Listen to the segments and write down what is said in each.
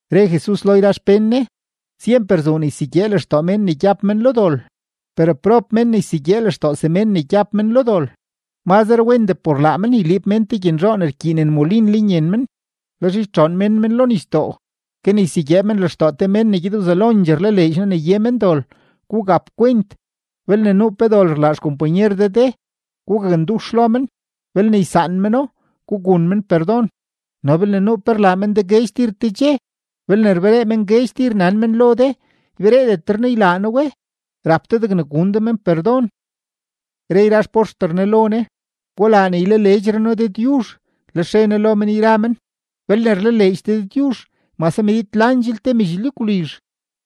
Re Jesus lo yra xpén Ne: ―Syemper zuu ne ysegyee lextoo mén ne gyab men lo dol; per ¡prob mén ne ysegyee lextoo semén ne gyab men lo dol! Mazre wendee por laa men yliib mén te gyenzhoo ne rkyiinen molin lenyen men, lex ytxoon mén men lo nisdoo, ke ne ysegyee men lextoo te men ne gyed wzelondxee rlaleedx noo ne ye men dol. Gugap kwent. ’Belne nuu pe dol rlaa xkompanyer de de, gugakndux lo men; belne ysaan meno, gugun men perdon. No belne nuu pe rlaa men de guedx tir te dxe, belne rberee men guedx tir nan men lo de: “Ybereedetre noo ylaa noo we”, rap de degne gun de men perdon. Re yra xpoxter Jesus lo Ne: ―Gulaa ne ylaleedxre noo Dëdyuzh. Lex re Ne lo men yra men: ―Belne rlaleedx de Dëdyuzh mase medid landxel te medx lyagwlizh,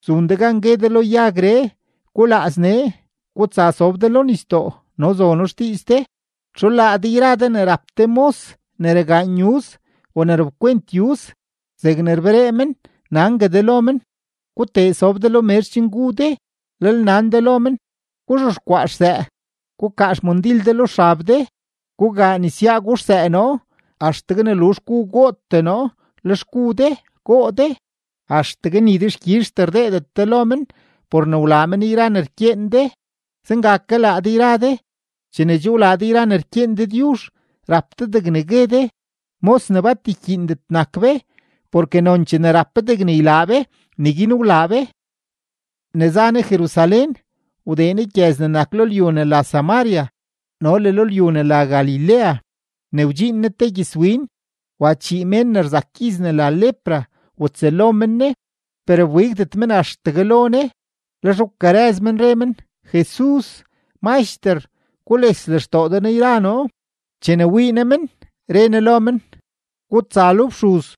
zun de gan gue de lo yagree: “Gulaaz nee, gutsa sob de lo nisdoo”, no zono xdiiz de. ’¿Txu laa de yra de ne rap te mos ne ragaan yuz o ne rapkwent yuz, zegne rberee men, nangue de lo men: “Gutee sob de lo mezh chen gu de”? Lel nan de lo men: “Guzhexkwaa xsëë. Gukaa xmandil de lo xab de, gugaa nesyaa guxsëë noo, axtegue ne luzh gu gootee noo; lex gu de, goo de.” Axtegue ni dexkyizhtee rdeedet de lo men por ne wlaa men yra ne rkyeen de. Zenga ke laa de yra de, chene che wlaa de yra ne rkyeen Dëdyuzh, rap de degne gue de: “Mos ne bat rkyiindet nak be, porke nonchee ne rap be degne ylaa be, neguin wlaa be.” Ne za Jesus Jerusalén, wdee Ne yra gyëz ne nak lo lyu ne la Samaria no le lo lyu ne la Galilea. Ne wdxiin Ne te gyëzwin, wa chii mén ne rzak gyiz ne la lepra watsëlo men Ne, per wbigdet men axtegue lo Ne. Lex wkarëz men, re men: ―¡Jesus, Maxter, gules lextoo de noo yra noo! Chene wii Ne men, re Ne lo men: ―Gutsa lo fxuz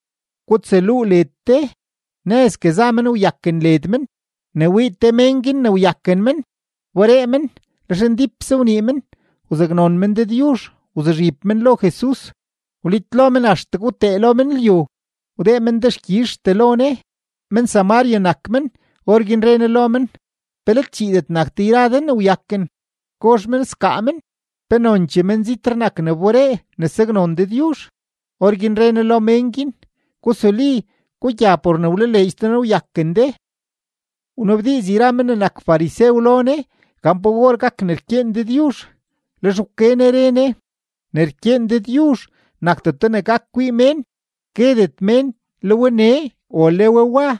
gutsaluu led de. Nëzgue za men, wyaken led men. Ne wii te mén guin ne wyaken men, wberee men, lex ndípse wnii men wzaknon men Dëdyuzh. Wzuzhib men lo Jesus, wlitlo men axtegue wtee lo men lyu, wdee men dexkyizhtee lo Ne. Men-Samaria nak men. Orguin re Ne lo men: ―¿Pe let chiidet nak de yra de ne wyaken? ¿Gozh men sgaa men? ¿Pe nonchee menzitree nak ne wberee ne saknon Dëdyuzh? Orguin re Ne lo mén guin: ―Gusuli, gugya; por ne wlaleedx de noo, wyaken de. Wnabdiiz yra men ne nak farisew lo Jesus gan pa or gak ne rkyeen Dëdyuzh, lex wke Ne re Ne: ―Ne rkyeen Dëdyuzh nakdeto ne gak kwii mén. Guedet mén: “Le we nee”, o “Le we wa”;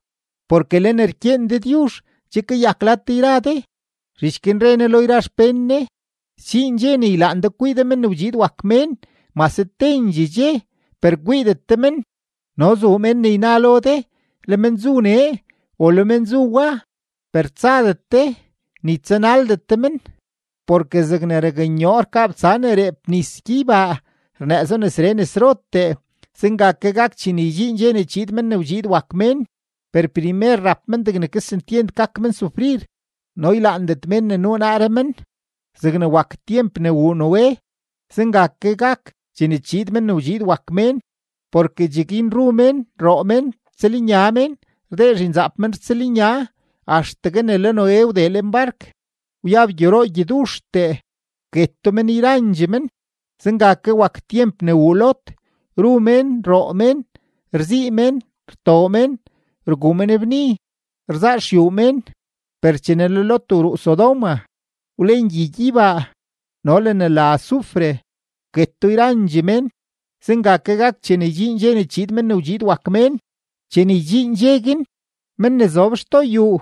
porke le ne rkyeen Dëdyuzh che kayak lad de yra de. Zhich guin re Ne lo yra xpén Ne: ―Sdxiin dxe ne ylaan de kwii de Men ne wdxiid wak Mén mase tendxee dxe, per kwiidet de men. No zuu mén ne yna lo de: “Le men zu nee”, o “Le men zu wa.” Per tsadet de, ni tsanaldet de men. Porke zegne raknyoo rkabtsa ne reep nis gyeybaa rnëëzo nesree nesrotee, zenga gak chene ydxiin dxe ne chiid Men ne wdxiid wak Mén. Per primer rap men degne kesentyent gak men sufrir, no ylaandet mén ne nuu naaree men. Zegne wak tyemp ne wuu Noé, zenga ke gak chene chiid Men ne wdxiid wak Mén. Porke cheguin ru mén, roo mén, rtsëlnya mén, rdee zhinzaap mén rtsëlnya, axtegue ne le Noé wdee lenbark; wyab gyoroo gyoduxtee, wketo men yrandxee men. Zenga ke wak tyemp ne wuu Lot: ru mén, roo mén, rzii mén, rtoo mén, rguu mén bni, rzaa xyuu mén; per chene le Lot wruu Sodoma, wlen gyi gyeybaa no le ne la azufre, wketo yrandxee mén. Zenga ke gak chene ydxiin dxe ne chiid Men ne wdxiid wak Mén. ’Chene ydxiin dxe guin, men ne zob xtoo xyuu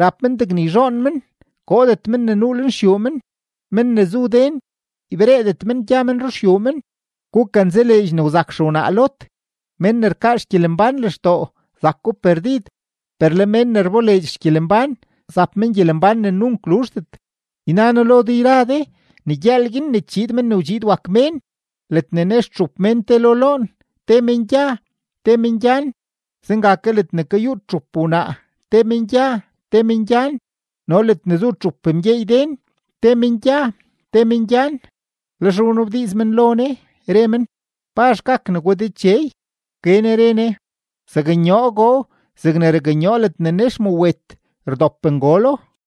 rap men degne yzhoon men, koodet men ne nuu lenxyuu men; men ne zu den ybereedet men gya men ruxyuu men. Gukanzaleedx ne wzak xewnaa Lot. Men ne rkaa xgyelembán lextoo, zako perdid; per le men ne rboleedx xgyelembán, zap men gyelembán ne nunk luzhdet. ’Yna noo lo de yra de ne gyëël guin ne chiid Men ne wdxiid wak Mén, ledne nex txup mén te lo loon, te men gya, te men gyan. Zenga ke ledne kayuut txup wnaa, te men gya, te men gyan. No ledne zu txup mgyeey den, te men gya, te men gyan. Lex wnabdiiz men lo Ne, re men: ―¿Pazh gak negwa, Dechey? Wke Ne re Ne: ―Zaknyoogoo zegne raknyoo ledne nex mawet, rdop ngolo.